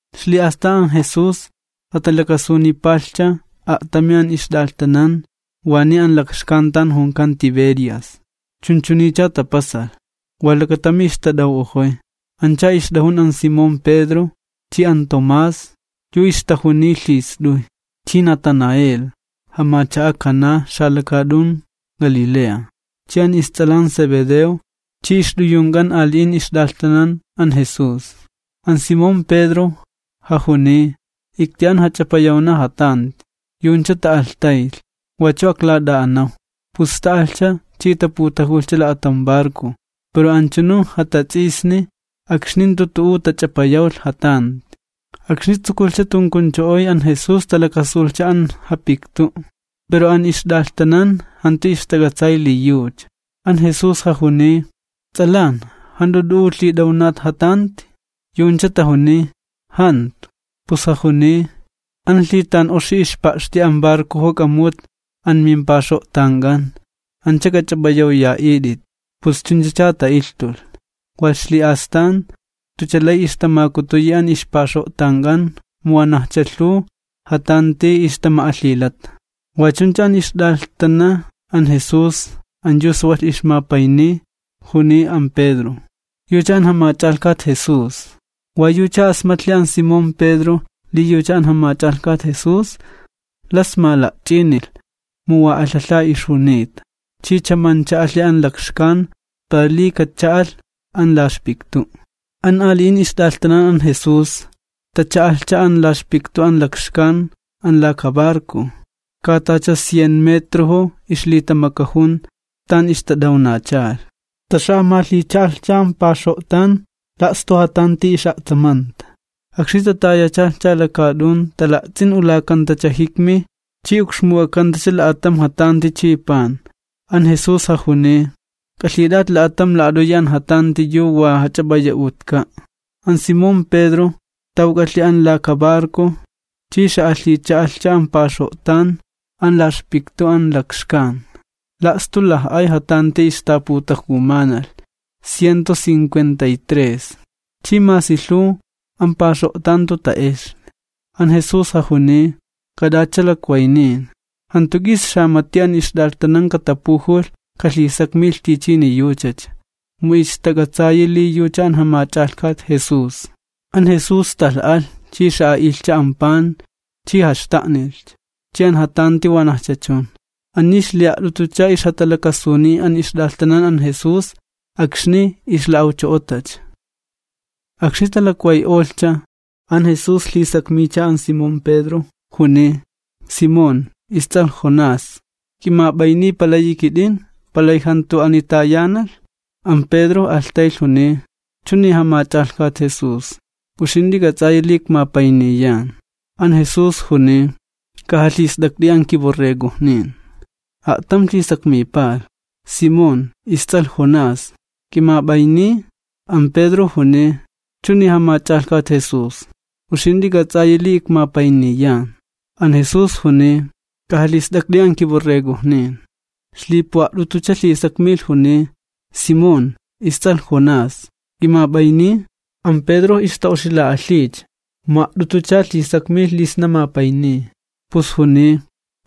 Ixli'astan an Jesús jatalakasunipalhcha a'tami an ixt'alhtanan waniy an lakxkan tan junkan Tiberias. Chunchuniycha tapasalh: Wa lakatami ixtat'aw'ojoy, ancha ixt'ajun an Simón Pedro, chi an Tomás, yu ixtajuniy lhist'uy, chi Natanael, jamacha'a Caná xalakaat'un Galilea, chi an ists'alan Zebedeo chi ixt'uyunk'an ali'in ixt'alhtanan an Jesús. An Simón Pedro jajuniy: ―Ikti'an jach'apayawna jatanti. Yu'uncha ta'alhtaylh: ―Wachu aklat'a'anaw. Pus ta'alhcha chi taputajulhcha la'atam barco. Pero anchunu jatats'isni akxni jantu tu'u tach'apayawlh jatanti. Akxni tsukulhcha tunkuncho'oy, an Jesús talakasulhcha an japiktu', pero an ixt'alhtanan jantu ixtak'atsay li yucha. An Jesús jajuniy: ―Ts'alan, ¿jant'u t'u'u lhit'awnat jatanti? Yu'uncha tajuniy: ―Jantu. Pus jajuniy: ―An lhitan'oxi ixpa'xti an barcojo k'amu'ut an mimpaxo'tank'an, anch'a k'ach'ap'ayawya'it'it. Pus chunchacha ta'ilhtulh, walh ixli'astan jantucha lay ixtamakutuyi an ixpaxo'tank'an mu wanajcha lhuw jatanti ixtama'alhilata. Wa chuncha an ixt'alhtana an Jesús an yu sawalh ixmapayniy, juniy an Pedro: ―¡Yucha an Jamach'alhkat Jesús! Wa yucha asmatlhi an Simón Pedro li yucha an Jamach'alhkat Jesús, las mala'ch'inilh, mu wa alhalha ixjunita, chi chamancha alhi an lakxkan, para li kacha'alh an la ixpiktu'. An ali'in ixt'alhtanan an Jesús tacha'alhcha an la ixpiktu an lakxkan, an laka barco, katacha cien metrojo ixlitamakajun tan ixtat'awnachalh, taxa'amalhicha'alhcha an paxo'tan la'stu jatanti ix'a'tsamanta. Akxni tatayachalhcha lakaat'un, tala'ts'in ulakantacha jikmi chi ukxmuk'akantacha la'atam jatanti chi pan. An Jesús jajuniy: ―K'alhit'at la'atam la'at'uyi an jatanti yu wa jach'ap'aya'utka'. An Simón Pedro tawk'alhi an laka barco chi xa'alhicha'alhcha an paxo'tan an la ixpiktu an lakxkan, la'stu laj'ay jatanti ixtaputajumanalh, ciento cincuenta y tres, chi masi lhuw, an paxo'tan jantu ta'exli. An Jesús jajuniy: ―K'at'atcha lakwaynin. Jantu k'is xamati an ixt'alhtanan katapujulh kalhisakmilh tichini yuchacha, mu ixtak'atsayi li yucha an Jamach'alhkat Jesús. An Jesús stalh alh chi xa'a'ilhcha an pan chi jaxta'nilhcha, chi an jatanti wanajcha chun. Ani ixli'a't'utucha ixjatalakasuniy an ixt'alhtanan an Jesús akxni ixla'awcho'otacha. Akxni talakway'olhcha, an Jesús lhisakmiycha an Simón Pedro, juniy: ―Simón, ists'alh Jonás, ¿k'imap'ayniy palayi kit'in, palay jantu ani tayanalh? An Pedro alhtaylh juniy: ―Chuni, Jamach'alhkat Jesús, uxint'i k'ats'ayi li ikmapayniyan. An Jesús juniy: ―K'ajalhist'akt'i an kiborregojnin. A'tam lhisakmipalh: ―Simón, ists'alh Jonás, ¿k'imap'ayniy? An Pedro juniy: ―Chuni, Jamach'alhkat Jesús, uxint'i k'ats'ayi li ikmapayniyan. An Jesús juniy: ―K'ajalhist'akt'i an kiborregojnin. Ixlipu'a't'utucha lhisakmilh juniy: ―Simón, ists'alh Jonás, ¿k'imap'ayniy? An Pedro ixta'oxila'alhiycha mu a't'utucha lhisakmilh li sna mapayniy, pus juniy: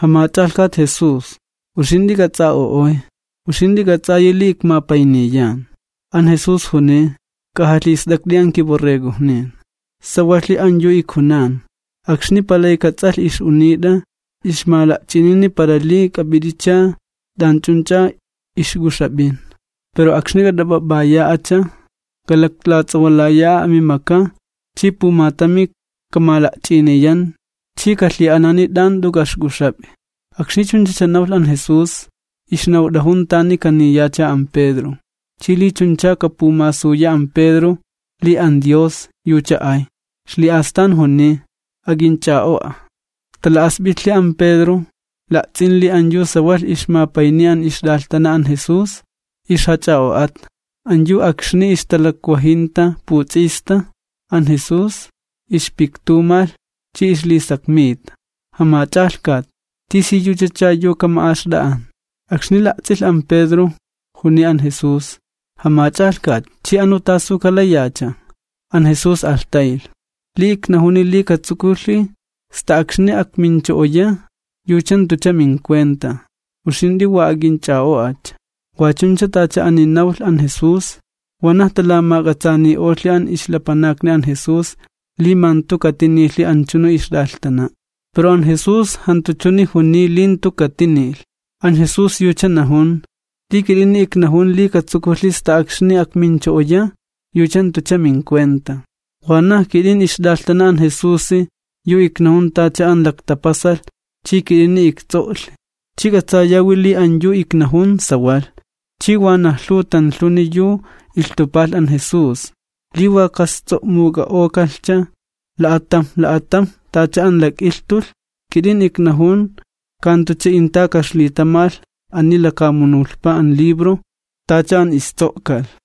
―Jamach'alhkat Jesús, uxint'i k'ats'a'o'oy, uxint'i k'ats'ayi li ikmapayniyan. An Jesús juniy: ―K'ajalhist'akt'i an kiborregojnin. Sawalhi an yu ijkunan, akxni palayka ts'alhk'at'i ix'unit'a, ixmala'ch'inini para li k'ap'it'icha t'anch'unch'a ixk'uxap'in. Pero akxni k'at'ap'ap'aya'acha, k'alaklats'awalaya'a amimaka chi pumatami kamala'ch'iniyan chi kalhi'anani t'an jant'u k'a'ixk'uxap'i. Akxni chunchacha nawlh an Jesús, ixnawt'ajun tani kapuniyacha an Pedro, chi li chuncha kapumasuya an Pedro li an Dios yucha ay. Ixli'astan juniy: ―¡Ak'inch'a'o'a! Tala'asp'itlhi an Pedro la'ts'in li an yu sawalh ixmapayniy an ixt'alhtana an Jesús, ixjach'a'o'ata, an yu akxni ixtalakwajinta puts'ista an Jesús ixpiktumalh chi ixlisakmita: “Jamach'alhkat, ¿tisiyuchacha yu kama'axt'a'an?” Akxni la'ts'ilh an Pedro juniy an Jesús: ―Jamach'alhkat, chi anu ¿tasu kalayacha? An Jesús alhtaylh: ―Li iknajuni li katsukulhi sta akxni akmincho'oya, yucha jantucha mincuenta, uxint'i wa ak'inch'a'o'acha. Wa chuncha, tacha ani nawlh an Jesús, wanaj talamak'atsaani'olhi an ixlapanakni an Jesús li ma jantu katinilhi anchunu ixt'alhtana'. Pero an Jesús jantu chuni juniy li jantu katinilh, an Jesús yucha najun: “Li kit'ini iknajun li katsukulhi sta akxni akmincho'oya, yucha jantucha mincuenta.” Wanaj kit'in, ixt'alhtana an Jesusi yu iknajun tacha an laktapasalh, chi kit'ini ikts'o'lhi, chi k'atsayawi li an yu iknajun, sawalh. Chi wanaj lhuw tanlhuni yu ilhtupalh an Jesús, li wa ka'ists'o'muk'a'okalhcha la'atamj la'atamj tacha an lak'ilhtulh, kit'in iknajun ka jantucha inta ka'ixlitamalh ani lakamunulhpa an libro tacha an ists'o'kalh.